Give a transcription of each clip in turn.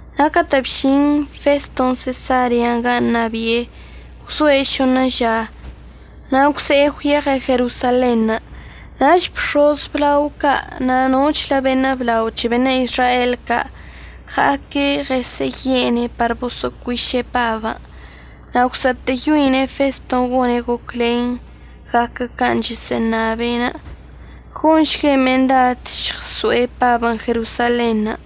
Na' catə' bžin Feston' Sesarean' gan' ṉabi'e, gwzoe' šoṉə ža na' gwze'e gwyeɉe' Jerosalenṉə'. Nach bx̱oz əblao ca' na' nochlə beṉə' blao c̱he beṉə' Izrael ca' ɉa'aque' ɉesə'əye'ene' par boso'ocuiše' Pabən'. Na' gwsa'atə'əyoine' Feston' gone' goclen gaquə can' chəsə'əṉabe', gonšgue' mendad əžɉso'e Pabən' Jerosalenṉə'.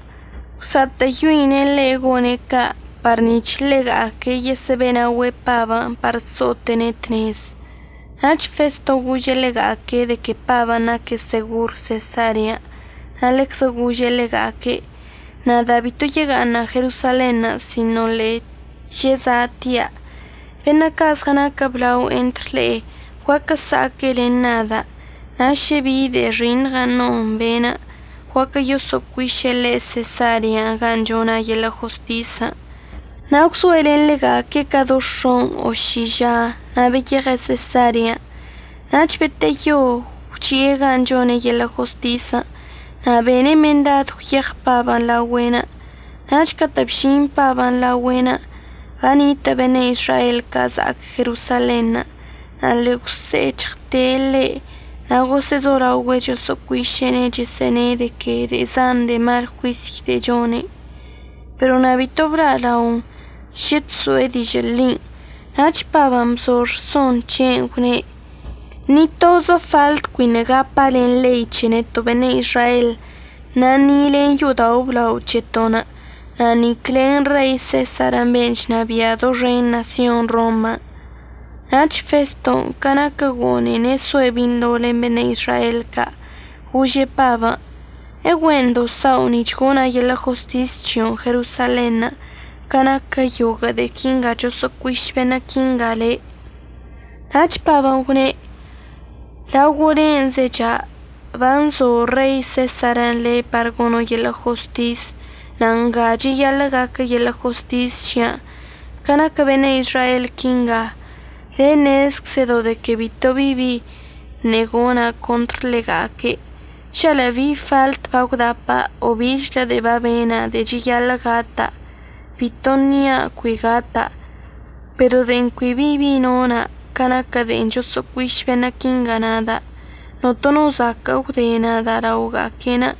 Gwsa'atə'əyoine' ḻe' gone' ca' par nic̱h ḻega'aque' yesə'əbe'enaogüe' Pabən' par so'ote'ene' tnezən'. Nach Feston' gože' ḻega'aque' de que Pabən' naque' segor Sesarean' na' ḻeczə gože' ḻega'aque': —Nada' bito yega'aṉa' Jerosalenṉə' sino ḻe'e cheza'atia'. Beṉə' ca' zɉənaquə blao entr le'e guaquə əsa'aque' len nada', na' šə bi de'e xiṉɉən' non be'enə', guaquə yoso'ocuiše' ḻe' Sesarean' gan' chona' yeḻə' jostisən'. Na' gwzoe' len ḻega'aque' ca do x̱on' o ši ža na' beyeɉe' Sesarean'. Nach beteyo gwchi'e gan' chone' yeḻə' jostisən' na' bene' mendad gwyeɉ Pabən' laogüe'enə'. Nach catə' bžin Pabən' laogüe'enə' banitə' beṉə' Izrael ca' za'ac Jerosalenṉə' na' ḻe'e gwse'ec̱hɉte' ḻe' na' gosə'əzolaogüe' chosə'əcuiše'ene' chəsə'əne' de que de'e zan de'e mal juisy de'e chone', pero na' bito bla'alaon šə chso'e dižə' ḻin'. Nach Pabən' bzo rson c̱he'enə' gwne': —Ni tozə faḻt cuiṉə' gapa' len ḻei c̱he neto' beṉə' Izrael, na' ni len yo'odao' əblao c̱heto'onə' na' nic len Rei Sesar ben' chnabia' doxen ṉasyon Roman'. Nach Feston' ca naquə gone'ene' soe' binḻo len beṉə' Izrael ca' gože' Pabən': —¿Egüe'endo' sa'o nic̱h gona' yeḻə' jostis c̱hio'onə' Jerosalenṉə' ca naquə yoguə' de'e quinga choso'ocuiš beṉə' quinga le'? Nach Pabən' gwne': —Laogo' len' zecha', banzo Rei Sesarən' le' par gono' yeḻə' jostis, na' nga cheyaḻə' gaquə yeḻə' jostis c̱hia'anə'. Ca naquə beṉə' Izrael quinga, le' ṉezczədo' de que bito bi bi ṉe'e gona' contr ḻega'aque'. Žalə' bi faḻt bagwdapa' o bichlə de'e babena' de'e cheyaḻə' gata', bito nia' cui gata'. Pero de'en cui bi bi nona' ca naquə de'en choso'ocuiš beṉə' quingan' nada', notono no zaquə' əgwde nada' laoga'aque'enə'.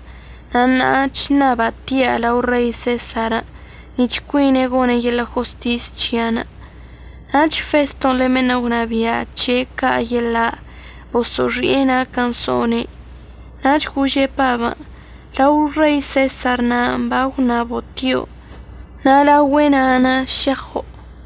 Na' ṉa'a chṉaba' tia' lao Rei Sesarən' nic̱h cuine' gone' yeḻə' jostis c̱hia'anə'. Nach Feston' len beṉə' gwnabia' c̱he' ca' yeḻa' boso'oxi'e naquən' so'one', nach gože' Pabən': —Lao Rei Sesar na'anə' bagwṉabo' tio', na' laogüe' na'anə' šeɉo'.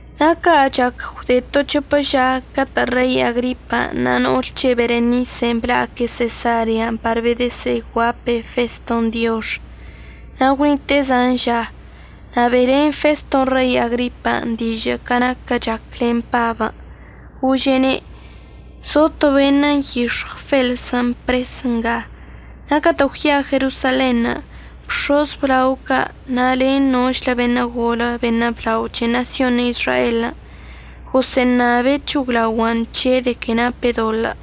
Na' ca' chac gwde to c̱hopə ža catə' Rei Agripa na' no'ol c̱he' Berenise bla'aque' Sesarean' par bedəsə'əguape' Feston' diox. Na' gwnite'e zan ža, na' be'elen Feston' Rei Agripan' dižə' ca naquən' chac len Pabən', gože'ene': —Zo to beṉə' nyix̱ɉw Felsən' pres nga. Na' catə' gwya'a Jerosalenṉə' bx̱oz əblao ca' na' len nochlə beṉə' golə beṉə' blao c̱he ṉasyon Izraelən' gosə'əṉabe' c̱hoglaogua'an c̱he' de que nape' doḻə'.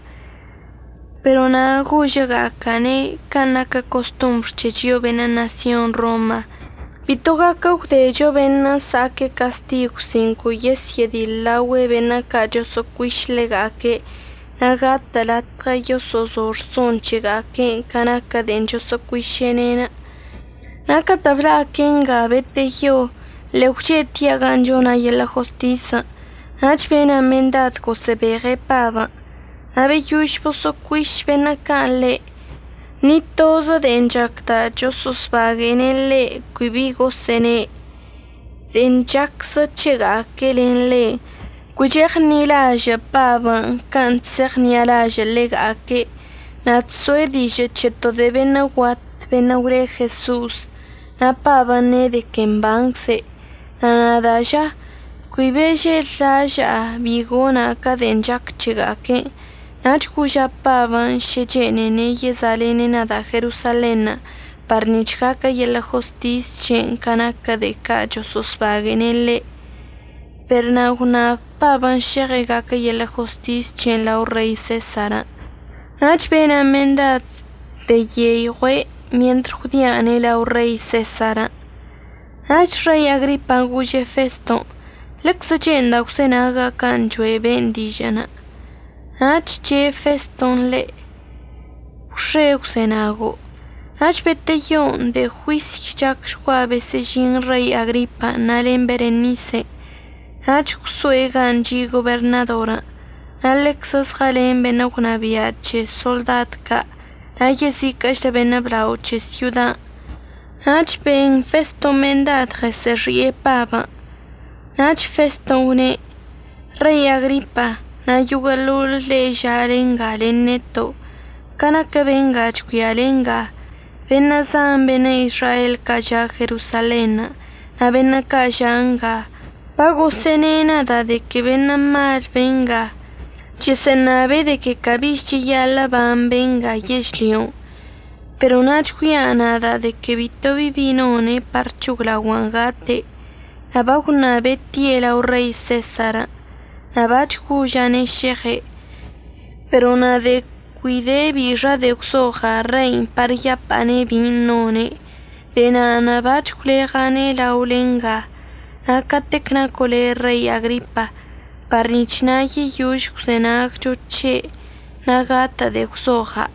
Pero na' gožəga'aca'ane' ca naquə costombr c̱he chio'o beṉə' ṉasyon Roma bito gaquə gwdecho beṉə' sa'aque' castigw sin cui yesyə'ədiḻlaogüe' beṉə' ca' choso'ocuiš ḻega'aque' na' gatə' latɉə yoso'ozo rson c̱hega'aque' ca naquə de'en choso'ocuiše'ene'. Na' catə' bla'aque' nga beteyo ḻe'e gwche'etia' gan' chona' yeḻə' jostisən', nach bena' mendad gosə'əbeɉe' Pabən'. Na' beyož boso'ocuiš beṉə' ca' ḻe', ni tozə de'en chacda' choso'osbague'ene' ḻe' cui bi gosə'əne'. De'en chaczə c̱hega'aque' len ḻe', cui cheɉṉi'alažə' Pabən' can' chse'eɉṉi'alažə' ḻega'aque' na' chso'e dižə' c̱he to de'e beṉə' guat beṉə' gwle Jeso'os, na' Pabən' ne' de que mbancze'. Na' nada' ža, cui bežellaža'a bi gona' ca de'en chac c̱hega'aque', nach goža' Pabən' šə chene'ene' yeza'alene' nada' Jerosalenṉə' par nic̱h gaquə yeḻə' jostis c̱he'enə' ca naquə de'e ca' choso'osbague'ene' ḻe'. Per na' gwṉab Pabən' šeɉe' gaquə yeḻə' jostis c̱he'enə' lao Rei Sesarən'. Nach bena' mendad beyeiɉue' mientr gwdi'ane' lao Rei Sesarən'. Nach Rei Agripan' gože' Feston': —Ḻeczə che'enda' gwzenaga' can' choe' ben' dižə'ənə'. Nach che' Feston' ḻe': —Gwx̱e əgwzenago'. Nach beteyon' de'e juisy chacchgua besə'əžin Rei Agripan' na' len Berenise, nach gwso'e gan' chi' goberṉadorən', na' ḻeczə zɉəlen beṉə' gwnabia' c̱he soḻdad ca' na' yeziquə'əchlə beṉə' blao c̱he syodan'. Nach ben Feston' mendad ɉesə'əxi'e Pabən'. Nach Feston' gwne': —Rei Agripa na' yoguə'əḻoḻ le'e ža'ale nga len neto', ca naquə benga chgüiale nga, beṉə' zan beṉə' Izrael ca' ža' Jerosalenṉə' na' beṉə' ca' ža' nga bagosə'əṉe' nada' de que beṉə' mal benga, chəsə'əṉabe' de que cabich cheyaḻə' əban benga yežlyon'. Pero na' chgüia' nada' de que bito bi bi none' par c̱hoglaogua'an gate', na' bagwṉabe' tie' lao Rei Sesarən' na' bac̱h goža'ane' šeɉe'enə'. Pero na' cui de bixa de'e gwzoɉa' rein' par yapa'ane' bin' none'. De'e na'anə' bac̱h gwleɉa'ane' laole nga, na' catec naco' le' Rei Agripa, par nic̱h na' yeyož əgwzenagcho c̱he' na' gatə' de'e gwzoɉa'.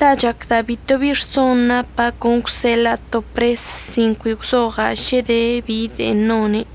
La' chacda' bito bi rson napa' con əgwseḻa'a to pres sin cui gwzoɉa' šə de bi de'en none'.